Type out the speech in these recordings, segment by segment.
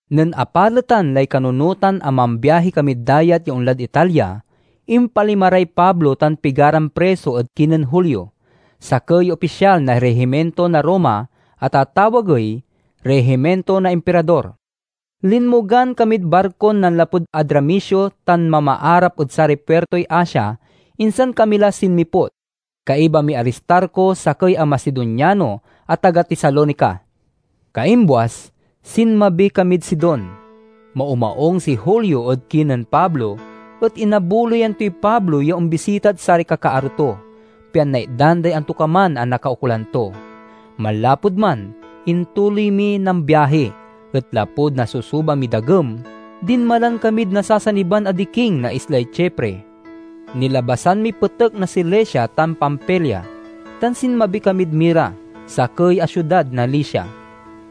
Nen apaletan lay kanunotan a mambiahi kamid dayat ya onlad Italia, impalima ray Pablo tan pigaran priso ed kinen Julio, sakey ya opisyal na rihiminto na Roma a tatawagey "Rihiminto na Impirador." Linmogan kamid barkon nanlapud Adramitio tan mamaarap ed saray puirtoy Asia, insan kami la sinmiput. Kaiba miy Aristarco, sakey a Macedoniano a taga Tesalonica. Kaimbuas, sinmabi kamid Sidon. Maumaung si Julio ed kinen Pablo, et inabuloyan toy Pablo ya ombisitad saray kakaaro to, pian naitdan day antokaman a nakaukolan to. Manlapud man intuloy miy nambiahi, et lapud nasusuba miy dagem, dinmalan kamid nasasaniban a diking na islay Chipre. Nilabasan miy petek na Cilicia tan Pamfilia, tan sinmabi kamid Mira, sakey a siudad na Licia.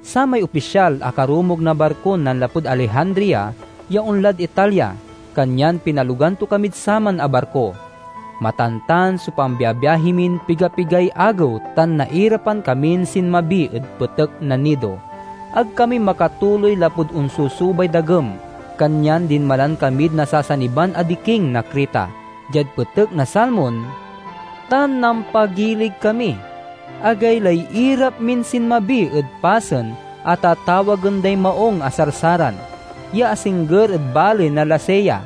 Samay opisyal akarumog na barkon nanlapud Alejandria ya onlad Italia, kanyan pinalogan to kamid saman a barko. Matantan so pambiabiahi min pigapigay agew tan nairapan kamin sinmabi ed petek na Gnido. Ag kami makatuloy lapud onsusubay dagem, kanyan dinmalan kamid nasasaniban a diking na Creta, diad petek na Salmon, tan nampagilig kami. Agaylay irap min sinmabi ed pasen a tatawagen day Maung a Sarsaran, ya asingger ed baley na Lasea.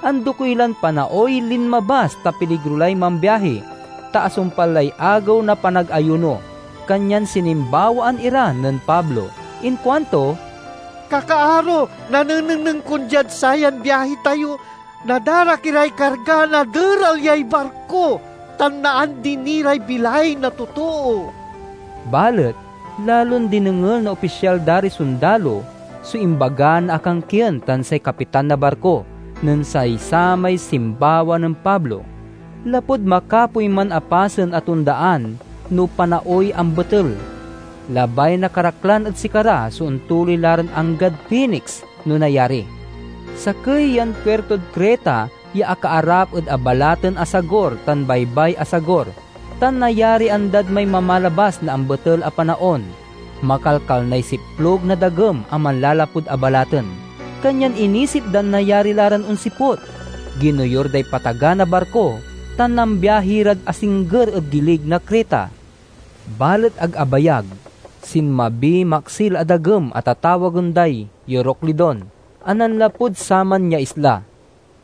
Andokey lan panaoy linmabas ta piligro lay mambiahi, ta asumpal lay Agew na Panagayuno. Kanyan sinimbawaan ira nen Pablo. Inkuanto, "Kakaaro, nanenengneng kon diad sayan biahi tayo, nadarak iray karga, naderal yay barko, tan naandi ni ray bilay na totoo." Balet lalon dinengel na opisyal da ray sondalo so imbaga na akankien tan say kapitan na barko nen say samay simbawa nen Pablo. Lapud makapoy man a pasen a tondaan no panaoy ambetel, labay na karaklan ed sikara so ontuloy la ran anggad Fenix, no nayari. Sakey yan puirtod Creta ya akaarap ed abalaten a sagur tan baybay a sagur, tan nayarian dad may mamalabas na ambetel a panaon. Makalkalnay siplug na dagem a manlalapud abalaten, kanyan inisip dan nayari la ran onsiput Ginoyur day pataga na barko tan nambiahi rad asingger ed gilig na Creta. Balet ag abayag, sinbamiy maksil a dagem a tatawagen day "Euroclidon" a nanlapud saman ya isla.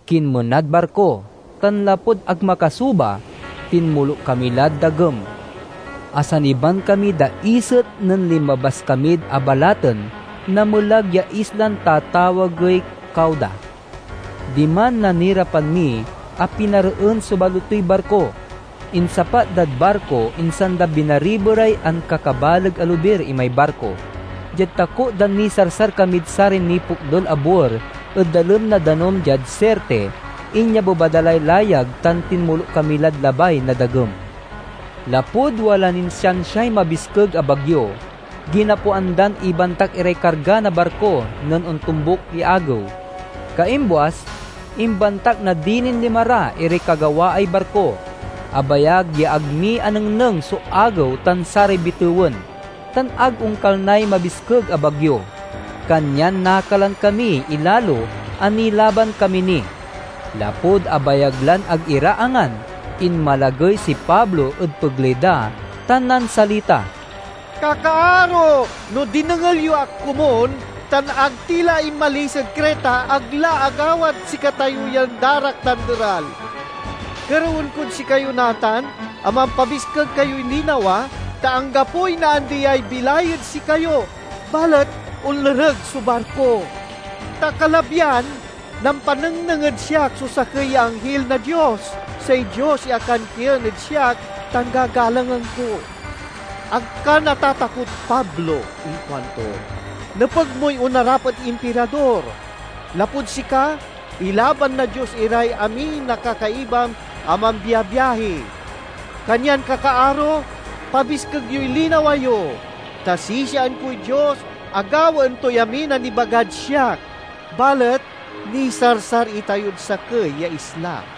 Kinmenad barko, tan lapud ag makasuba, tinmoluk kami lad dagem. Asaniban kamiy daiset nen linmabas kamid abalaten na melag ya islan tatawagey Cauda. Diman, nanirapan mi a pinareen so balotoy barko. Insapat dad barko, insan da binariberay ankakabaleg a lobir imay barko. Diad takot dan nisarsar kamid saray nipokdul a buer ed dalem na danum diad Sirte, inyabeba da lay layag tan tinmoluk kami lad labay na dagem. Lapud wala nin siansiay mabiskeg a bagyo, ginapoan dan ibantak iray karga na barko nen ontombuk ya agew. Kaimbuas, imbantak na dilin lima ra iray kagawaay barko. Abayag ya ag mi anengneng so agew tan saray bitewen, tan ag onkalnay mabiskeg a bagyo, kanyan nakalan kamiy ilalo a nilaban kami ni. Lapud abayag lan ag ira angan, inmalagey si Pablo ed pegley da tan nansalita, "Kakaaro, no dinengel yo ak komun tan ag ti la inmalis ed Creta, ag la agawad sikatayo yan darak tan deral. Kerewen kod sikayo natan a mampabiskeg kayoy linawa, ta anggapoy naandiay bilay ed sikayo, balet onlereg so barko. Ta kalabyan, nampanengneng ed siak so sakey ya anghil na Dios, say Dios ya akankien ed siak tan gagalangen ko. 'Ag ka natatakot, Pablo!' inkuanto. 'Nepeg moy onarap ed Impirador. Lapud sika, ilaban na Dios iray amin a kakaibam a mambiabiahi.' Kanyan, kakaaro, pabiskeg yoy linawa yo! Ta sisiaen koy Dios a gawaen toy amin a nibagad siak. Balet nisarsar itayod sakey ya isla."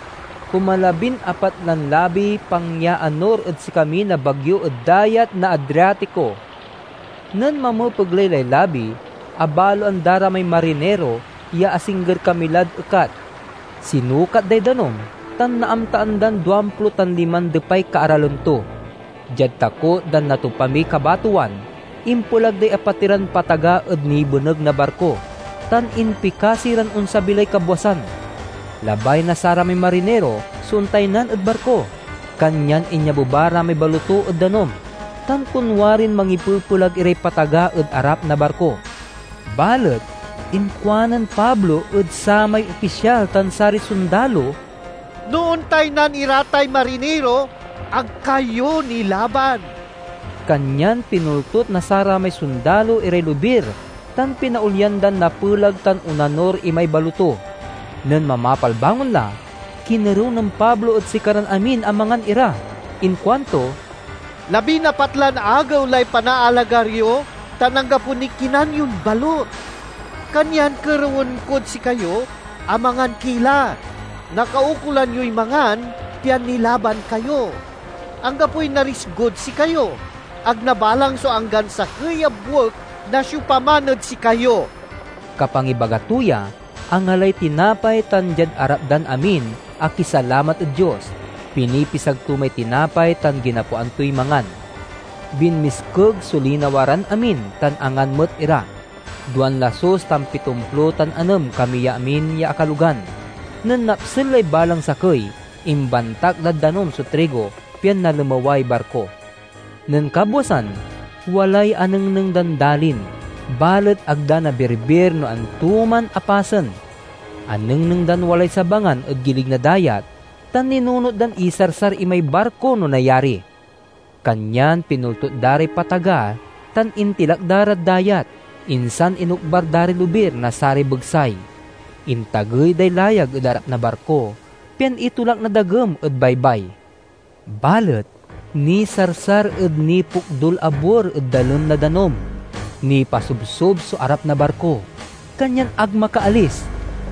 Kumalabinapat lan labiy pangyaanur ed sikami na bagyo ed Dayat na Adriatico. Nen mamepegley lay labi, abaloan da ra may mariniro ya asingger kami lad ekat. Sinukat day danum, tan naamtaan dan duamplo tan liman depay kaaralem to. Diad takot dan natopa miy kabatowan, impelag day apatiran pataga ed nibeneg na barko, tan impikasi ran onsabi lay kabwasan. Labay na saramay mariniro so ontaynan ed barko, kanyan inyabeba ra may baloto ed danum tan konwarin mangipepelag iray pataga ed arap na barko. Balet inkuanen Pablo ed samay opisyal tan saray sondalo, "No ontaynan ira tay mariniro, ag kayo nilaban." Kanyan pinoltut na saramay sondalo iray lobir tan pinaolyan dan napelag tan onanur imay baloto. Nen mamapalbangon la, kinerew nen Pablo ed sikaran amin a mangan ira. Inkuanto, "Labinapat lan agew lay panaalagar yo, tan anggapo niy kinan yon balut. Kanyan kerewen kod sikayo a mangan ki la! Nakaukolan yoy mangan pian nilaban kayo. Anggapoy narisgod sikayo. Ag nabalang so anggan sakey a buek na siopaman ed sikayo!" Kapangibaga to ya, angalay tinapay, tan diad arap dan amin akisalamat ed Dios, pinipisag to may tinapay, tan ginapoan toy mangan. Binmiskeg so linawa ran amin, tan angan met ira. Duan lasus tan pitomplo tan anem kami ya amin ya akalogan. Nen napsel lay balang sakey, imbantak dad danum so trigo, pian nalemeway barko. Nen kabwasan, walay anengneng dan dalin, balet ag da nabirbir no anto man a pasen. Anengneng dan walay sabangan ed gilig na dayat, tan ninunot dan isarsar imay barko, no nayari. Kanyan pinoltut da ray pataga, tan intilak da rad dayat, insan inokbar da ray lobir na saray begsay. Intagey day layag ed arap na barko, pian itolak na dagem ed baybay. Balet nisarsar ed nipokdul a buer ed dalem na danum. Nipasobsob so arap na barko, kanyan ag makaalis.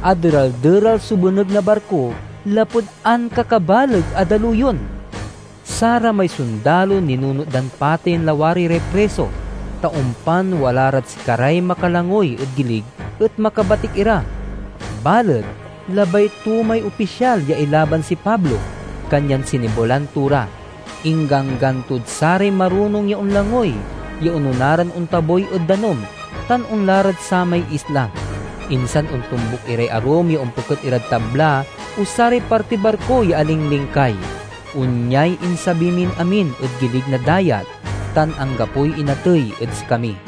Aderal-deral so beneg na barko lapud ankakabaleg a daluyon. Saramay sondalo ninunot dan pateyen lawari ray priso, ta ompan wala rad sikaray makalangoy ed gilig et makabatik ira. Balet labay to may opisyal ya ilaban si Pablo, kanyan sinebelan to ra. Ingganggan tod saray marunong ya onlangoy ya onona ran ontabuy ed danum tan onla rad samay isla, insan ontombuk iray arum ya ompeket irad tabla o saray partiy barko ya alinglingkay. Onyay insabi min amin ed gilig na dayat, tan anggapoy inatey ed sikami.